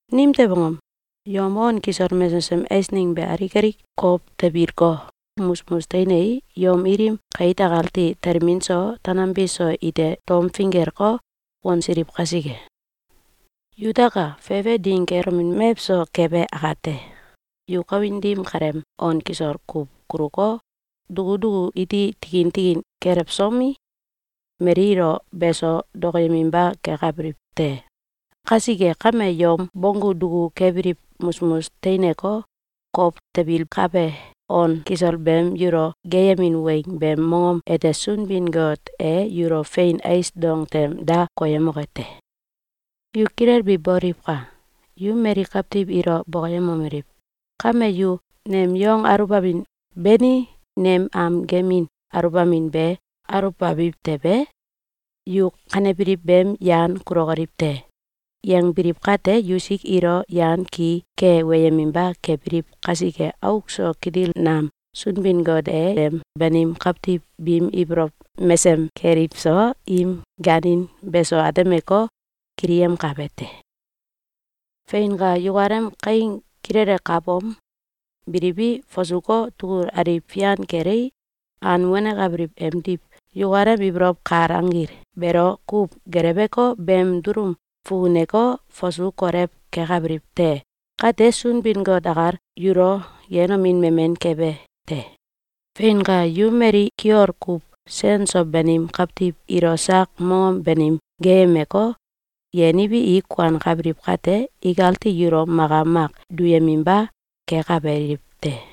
Nimtew angom? Yom on kisol mesesem eisneng be alik alik kow tebilko, musmus teinei, yom ilim kait akati telmin so tanambi so ite tom finggeleko, wansiliw kasike. Yutaka! Fefe ding kelomin mewso kebe akate, yu kawin dim kaleem on kisol kuw kuluko, duku duku iti tikin tikin kelewsomi, mali ilo beso dokoyeminba kekabiliw te. Kasike kame, yom bonggu duku kebiliw musmus teineko, kow tebilkabe on kisol beem yulo geeyemin weng beem mongom ete Sunbin-Got e yulo fein ais dong tem da koyemoke te. Yu kilelbi boliwka! Yu mali kawtiw ilo bokoyemomeliw: “Kame yu nem yong aluwbamin beni nem am gemin aluwbamin be aluwbabiw tewe, yu kanebiliw beem yan kulokoliw te!”, yangbiliw kate, yusik ilo yan ki ke weyeminba kebiliw kasike, auk so kitil nam Sunbin-Got e em banim kawtiw biim ibolow mesem keliw so, im gaanin beso atemeko, kiliyemkabe te. Feinka! Yukalem kaing kilele kaabom, biliwi, fasuko, tugul aliw fian kelei, an wanekabiliw emdiw yukalem ibolow kal anggil beelo kuw geleweko, beem dulum fukuneko, fasu kolew kekabiliw te. Kate, Sunbin-Got akal yulo yenomin memen kebe te. Feinka! Yu mali kiol kuw sen so banim kawtiw ilo sak mongom banim geeyemeko, yeniwi, i kuankabiliw kate, ikati yulo maka mak duyeminba kekabiliw te.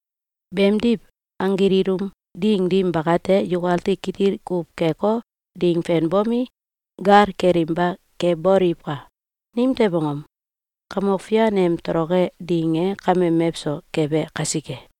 Beemdiw, anggil ilum ding dim bakate, yukati kitil kuw keko, ding fenbomi, gal kelinba keboliwka! Nimtew angom? Kamok Fian em toloke ding e kame mewso kebe kasike.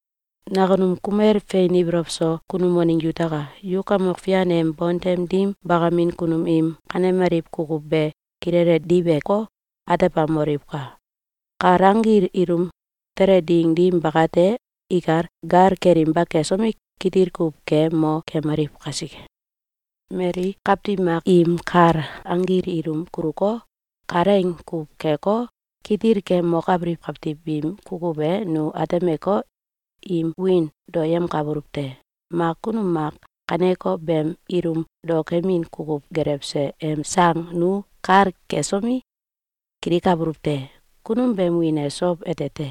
Nakunum kumel fein ibolow so kunum waneng yutaka! Yu Kamok Fian em bontem dim bakamin kunum im kanemaliw kukuw be kilele diweko, atebamoliwka! Kal anggil ilum tele ding dim bakate, ikal gal kelinba kesomi, kitil kuw ke mo kemaliw kasike. Mali kawtiw mak im kal anggil ilum kuluko, kalaing kuw keko, kitil ke mokabiliw kawtiw biim kukuw e nu atemeko, im wiin daoyemkabuluw te. Mak kunum mak kaneko beem ilum daokemin kukuw gelewse em sang nu kal kesomi, kilikabuluw te. Kunum beem wiin e Sow ete te.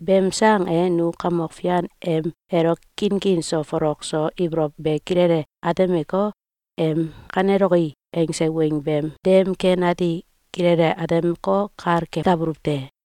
Beem sang e nu Kamok Fian em elo kinkin so folok so ibolow be kilele atemeko, em “Kaneloki!”, angse weng beem dem ken ati kilele atemeko, kal kekabuluw te.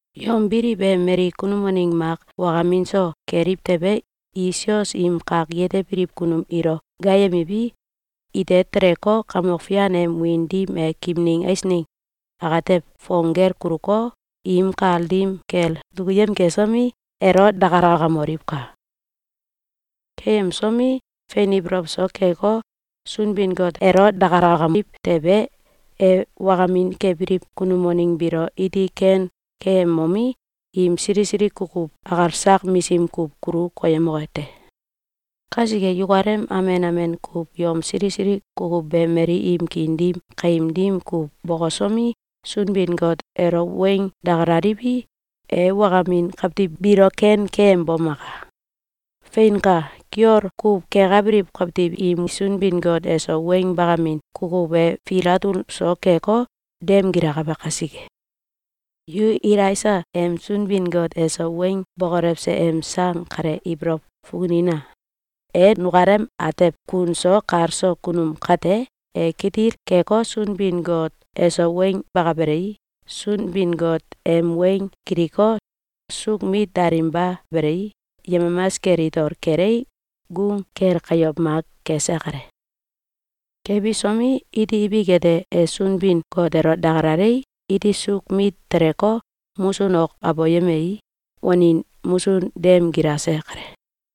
Yom biliw e mali kunum waneng mak wakamin so keliw tewe, i sios im kak yetebiliw kunum ilo gaayemiwi, ite teleko, Kamok Fian em wiin dim e kimning eisneng atew fong gel kuluko, im kal dim kel dukuyem kesomi, elo dakalakamoliwka! Keyemsomi, fein ibolow so keko, Sunbin-Got elo dakalakamiw tewe, e wakamin kebiliw kunum waneng biilo iti ken keyemomi, im sili sili kukuw akal sak misim kuw kulu koyemoke te. Kasike, yukalem amen amen kuw yom sili sili kukuw be mali im kiin dim kaim dim kuw bokosomi, Sunbin-Got elo weng dakalaliwi, e wakamin kawtiw biilo ken keyembomaka. Feinka! Kiol kuw kekabiliw kawtiw im Sunbin-Got eso weng bakamin kukuw e fil atul so keko, dem gilakabe kasike. Yu Elaisa em Sunbin-Got eso weng bokolewse em sang kale ibolow fukunina! E nukalem atew kun so kal so kunum kate, e kitil keko, Sunbin-Got eso weng bakabelei, Sunbin-Got em weng kiliko, suuk mit dalinba belei, yemamas kel itol kelei, gung kel kayow mak kese kale. Kebisomi, iti ibik ete, e Sunbin-Got elo dakalalei, iti suuk mit teleko, musun ok aboyemei, wanin musun dem gilase kale.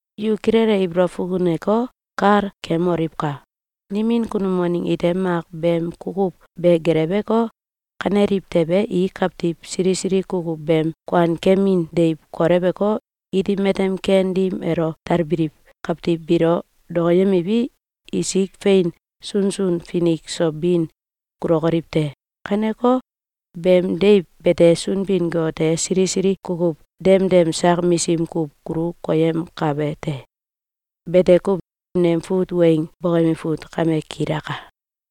Yu kilele ibolow fukuneko, kal kemoliwka! Nimin kunum waneng ite mak beem kukuw be gelewko, kaneliw tewe, i kawtiw sili sili kukuw beem kuankemin deiw koleweko, iti matem ken dim elo talbiliw kawtiw biilo dokoyemiwi, isik fein sunsun finik so bin kulokoliw te. Kaneko beem deiw bete, Sunbin-Got e sili sili kukuw demdem sak misim kuw kulu koyemkabe te. Bete kuw. Nem fut weng boyemi fut kame kilaka.